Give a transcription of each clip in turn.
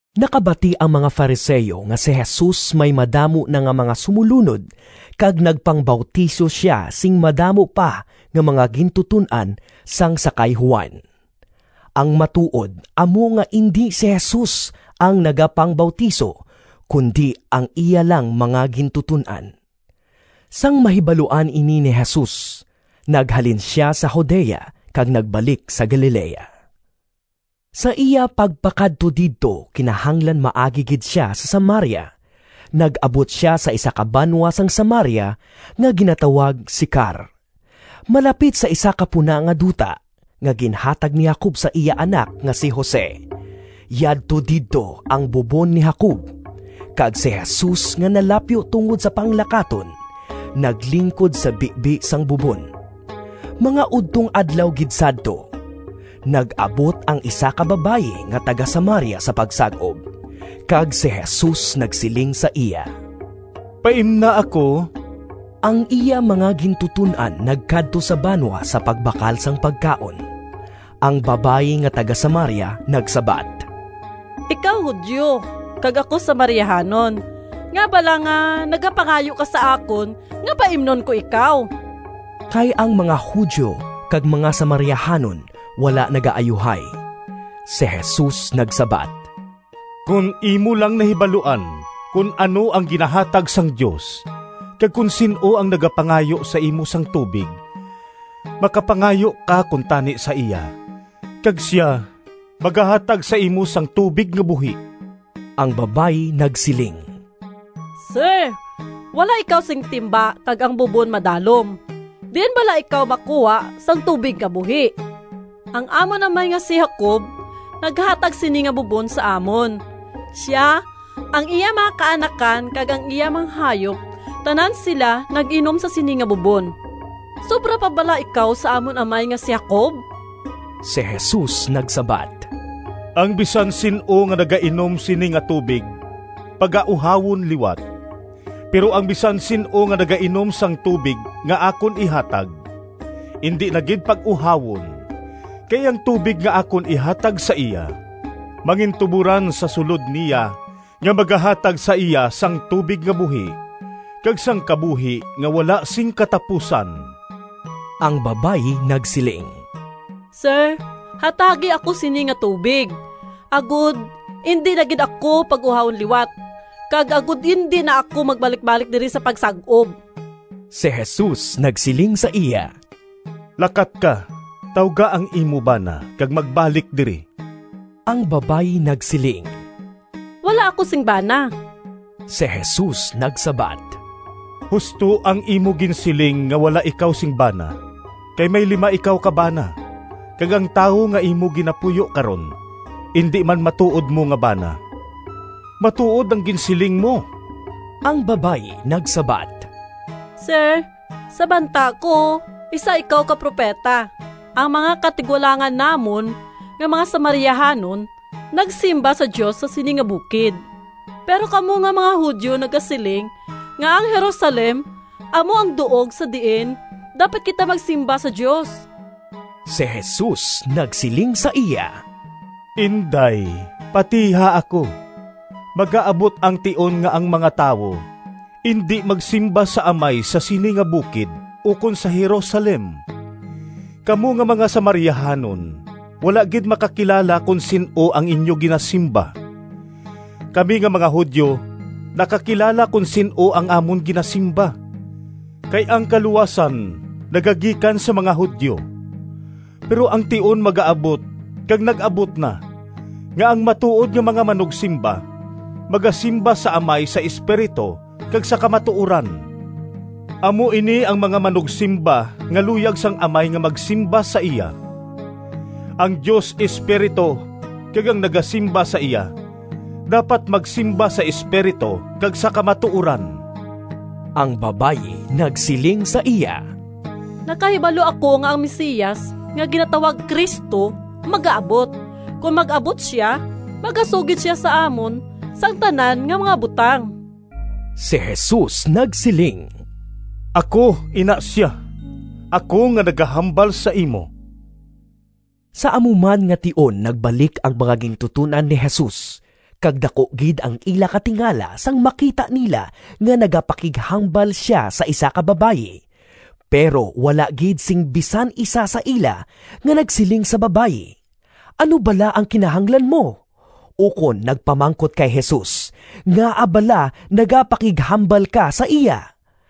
Nakabati ang mga Fariseo nga si Jesus may madamo na nga mga sumolunod kag nagpangbautiso sia sing madamo pa nga mga gintuton-an sang sa kay Juan. (Ang matuod amo nga indi si Jesus ang nagapangbautiso, kundi ang iya lang mga gintuton-an.) Sang mahibaluan ini ni Jesus, naghalin sia sa Judea kag nagbalik sa Galilea. Sa iya pagpakadto didto kinahanglan maagi gid sia sa Samaria. Nag-abot sia sa isa ka banwa sang Samaria nga ginatawag Sicar, malapit sa isa ka puna nga duta nga ginhatag ni Jacob sa iya anak nga si Jose. Yadto didto ang bubon ni Jacob, kag si Jesus nga nalapyo tungod sa panglakaton, naglingkod sa bibi sang bubon. Mga udtong adlaw gid sadto. Nag-abot ang isa ka babayi nga taga-Samaria sa pagsag-ob, kag si Jesus nagsiling sa iya, “Paimna ako.” (Ang iya mga gintuton-an nagkadto sa banwa sa pagbakal sang pagkaon.) Ang babayi nga taga-Samaria nagsabat, “Ikaw Judio kag ako Samariahanon, ngaa bala nga nagapangayo ka sa akon nga paimnon ko ikaw?” (Kay ang mga Judio kag mga Samariahanon wala nagaayuhay.) Si Jesus nagsabat, “Kon imo lang nahibaluan kon ano ang ginahatag sang Dios, kag kon sin-o ang nagapangayo sa imo sang tubig makapangayo ka kuntani sa iya kag sia magahatag sa imo sang tubig nga buhi.” Ang babayi nagsiling, “Sir, wala ikaw sing timba kag ang bubon madalom. Diin bala ikaw makuha sang tubig nga buhi? Ang amon amay nga si Jacob naghatag sini nga bubon sa amon; sia, ang iya mga kaanakan, kag ang iya mga hayop, tanan sila nag-inom sa sini nga bubon. Sobra pa bala ikaw sa amon amay nga si Jacob?” Si Jesus nagsabat, “Ang bisan sin-o nga nagainom sini nga tubig pagauhawon liwat, pero ang bisan sin-o nga nagainom sang tubig nga akon ihatag indi na gid pag-uhawon. Kay ang tubig nga akon ihatag sa iya mangintuboran sa sulod niya nga magahatag sa iya sang tubig nga buhi kag sang kabuhi nga wala sing katapusan.” Ang babayi nagsiling, “Sir, hatagi ako sini nga tubig, agod indi na gid ako pag-uhawon liwat, kag agod indi na ako magbalikbalik diri sa pagsag-ob.” Si Jesus nagsiling sa iya, “Lakat ka, tawga ang imo bana, kag magbalik diri.” Ang babayi nagsiling, “Wala ako sing bana.” Si Jesus nagsabat, “Husto ang imo ginsiling nga wala ikaw sing bana. Kay may lima ikaw ka bana, kag ang tawo nga imo ginapuyo karon indi man matuod mo nga bana. Matuod ang ginsiling mo.” Ang babayi nagsabat, “Sir, sa banta ko isa ikaw ka propeta. Ang mga katigulangan namon nga mga Samariahanon nagsimba sa Dios sa sini nga bukid, pero kamo nga mga Judio nagasiling nga ang Jerusalem amo ang duog sa diin dapat kita magsimba sa Dios.” Si Jesus nagsiling sa iya, “Inday, patiha ako, magaabot ang tion nga ang mga tawo indi magsimba sa Amay sa sini nga bukid ukon sa Jerusalem. Kamo nga mga Samariahanon wala gid makakilala kon sin-o ang inyo ginasimba. Kami nga mga Judio nakakilala kon sin-o ang amon ginasimba, kay ang kaluwasan nagagikan sa mga Judio. Pero ang tion magaabot, kag nag-abot na, nga ang matuod nga mga manugsimba magasimba sa Amay sa espiritu kag sa kamatuoran. Amo ini ang mga manugsimba nga luyag sang Amay nga magsimba sa iya. Ang Dios Espiritu, kag ang nagasimba sa iya dapat magsimba sa espiritu kag sa kamatuoran.” Ang babayi nagsiling sa iya, “Nakahibalo ako nga ang Mesias, nga ginatawag Cristo, magaabot. Kon mag-abot sia, magasugid sia sa amon sang tanan nga mga butang.” Si Jesus nagsiling, “Ako ina sia, ako nga nagahambal sa imo.” Sa amo man nga tion nagbalik ang mga gintuton-an ni Jesus, kag daku gid ang ila katingala sang makita nila nga nagapakighambal sia sa isa ka babayi. Pero wala gid sing bisan isa sa ila nga nagsiling sa babayi, “Ano bala ang kinahanglan mo?” ukon nagpamangkot kay Jesus, “Ngaa bala nagapakighambal ka sa iya?”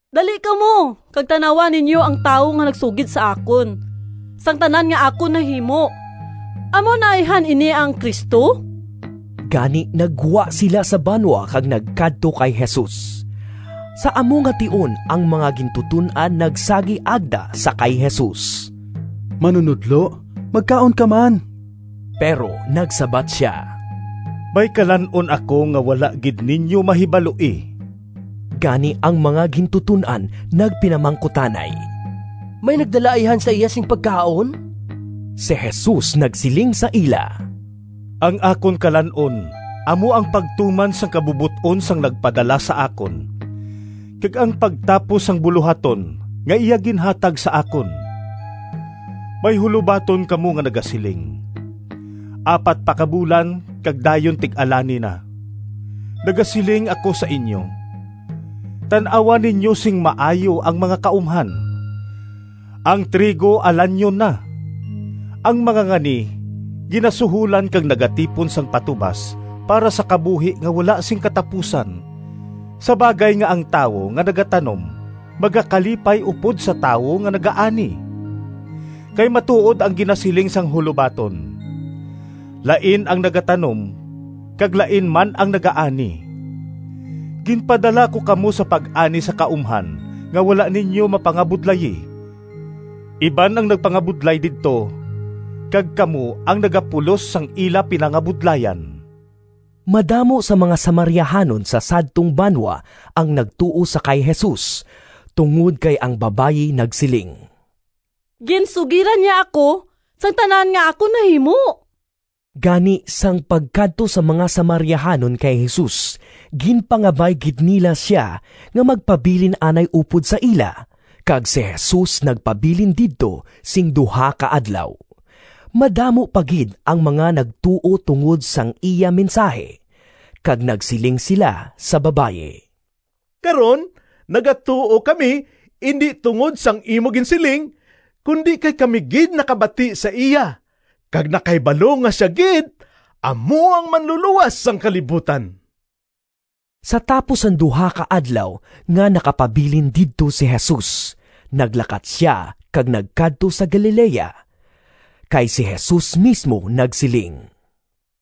“Dali kamo kag tan-awa ninyo ang tawo nga nagsugid sa akon sang tanan nga akon nahimo. Amo na ayhan ini ang Cristo?” Gani naggwa sila sa banwa kag nagkadto kay Jesus. Sa amo nga tion ang mga gintuton-an nagsagi agda sa kay Jesus, “Manunodlo, magkaon ka man!” Pero nagsabat sia, “May kalan-on ako nga wala gid ninyo mahibaloi.” Gani ang mga gintuton-an nagpinamangkutanay, “May nagdala ayhan sa iya sing pagkaon?” Si Jesus nagsiling sa ila, “Ang akon kalan-on amo ang pagtuman sang kabubot-on sang nagpadala sa akon kag ang pagtapos sang bulohaton nga iya ginhatag sa akon. May hulobaton kamo nga nagasiling, ‘Apat pa ka bulan kag dayon tig-alani na.’ Nagasiling ako sa inyo, tan-awa ninyo sing maayo ang mga kaumhan, ang trigo alanyon na! Ang mangangani ginasuholan kag nagatipon sang patubas para sa kabuhi nga wala sing katapusan, sa bagay nga ang tawo nga nagatanom magakalipay upod sa tawo nga nagaani. Kay matuod ang ginasiling sang hulobaton, ‘Lain ang nagatanom, kag lain man ang nagaani.’ Ginpadala ko kamo sa pag-ani sa kaumhan nga wala ninyo mapangabudlayi. Iban ang nagpangabudlay didto, kag kamo ang nagapulos sang ila pinangabudlayan.” Madamo sang mga Samariahanon sa sadtong banwa ang nagtuo sa kay Jesus, tungod kay ang babayi nagsiling, “Ginsugiran niya ako sang tanan nga akon nahimo.” Gani sang pagkadto sang mga Samariahanon kay Jesus, ginpangabay gid nila sia nga magpabilin anay upod sa ila, kag si Jesus nagpabilin didto sing duha ka adlaw. Madamo pa gid ang mga nagtuo tungod sang iya mensahi, kag nagsiling sila sa babayi, “Karon nagatuo kami indi tungod sang imo ginsiling, kundi kay kami gid nakabati sa iya, kag nakahibalo nga sia gid amo ang Manlulowas sang kalibutan.” Sa tapos sang duha ka adlaw nga nakapabilin didto si Jesus, naglakat sia kag nagkadto sa Galilea. Kay si Jesus mismo nagsiling,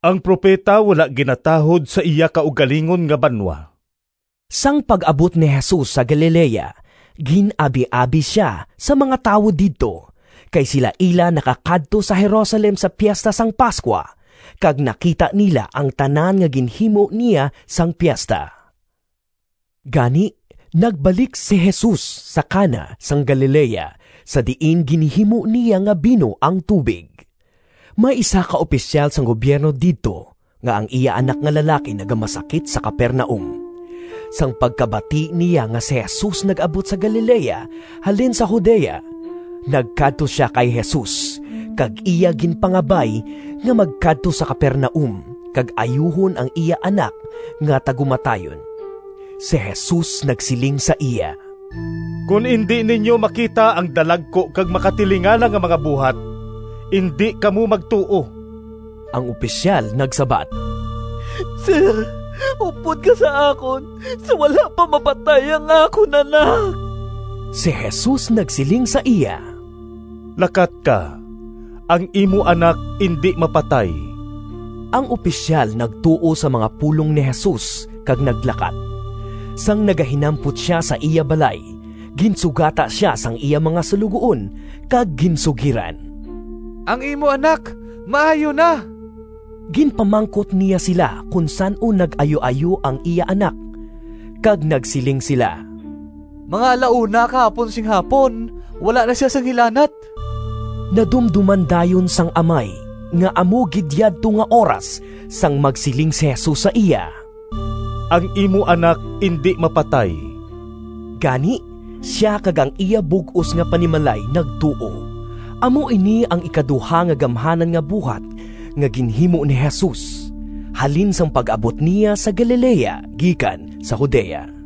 “Ang propeta wala ginatahod sa iya kaugalingon nga banwa.” Sang pag-abot ni Jesus sa Galilea, gin-abiabi sia sang mga tawo didto, kay sila ila nakakadto sa Jerusalem sa Piesta sang Pascua, kag nakita nila ang tanan nga ginhimo niya sang piesta. Gani nagbalik si Jesus sa Cana sang Galilea sa diin ginhimo niya nga bino ang tubig. May isa ka opisyal sang gubyerno didto nga ang iya anak nga lalaki nagamasakit sa Capernaum. Sang pagkabati niya nga si Jesus nag-abot sa Galilea halin sa Judea, nagkadto sia kay Jesus, kag iya ginpangabay nga magkadto sa Capernaum kag ayuhon ang iya anak nga tagumatayon. Si Jesus nagsiling sa iya, “Kon indi ninyo makita ang dalagku kag makatilingala nga mga buhat, indi kamo magtuo.” Ang opisyal nagsabat, “Sir, upod ka sa akon sa wala pa mapatay ang akon anak.” Si Jesus nagsiling sa iya, “Lakat ka, ang imo anak indi mapatay!” Ang opisyal nagtuo sa mga pulong ni Jesus kag naglakat. Sang nagahinampot sia sa iya balay, ginsugata sia sang iya mga suloguon kag ginsugiran, “Ang imo anak maayo na.” Ginpamangkot niya sila kon san-o nag-ayuayo ang iya anak, kag nagsiling sila, “Mga alauna kahapon sing hapon wala na sia sing hilanat.” Nadumdoman dayon sang amay nga amo gid yadto nga oras sang magsiling si Jesus sa iya, “Ang imo anak indi mapatay.” Gani sia kag ang iya bug-os nga panimalay nagtuo. Amo ini ang ikaduha nga gamhanan nga buhat nga ginhimo ni Jesus halin sang pag-abot niya sa Galilea gikan sa Judea.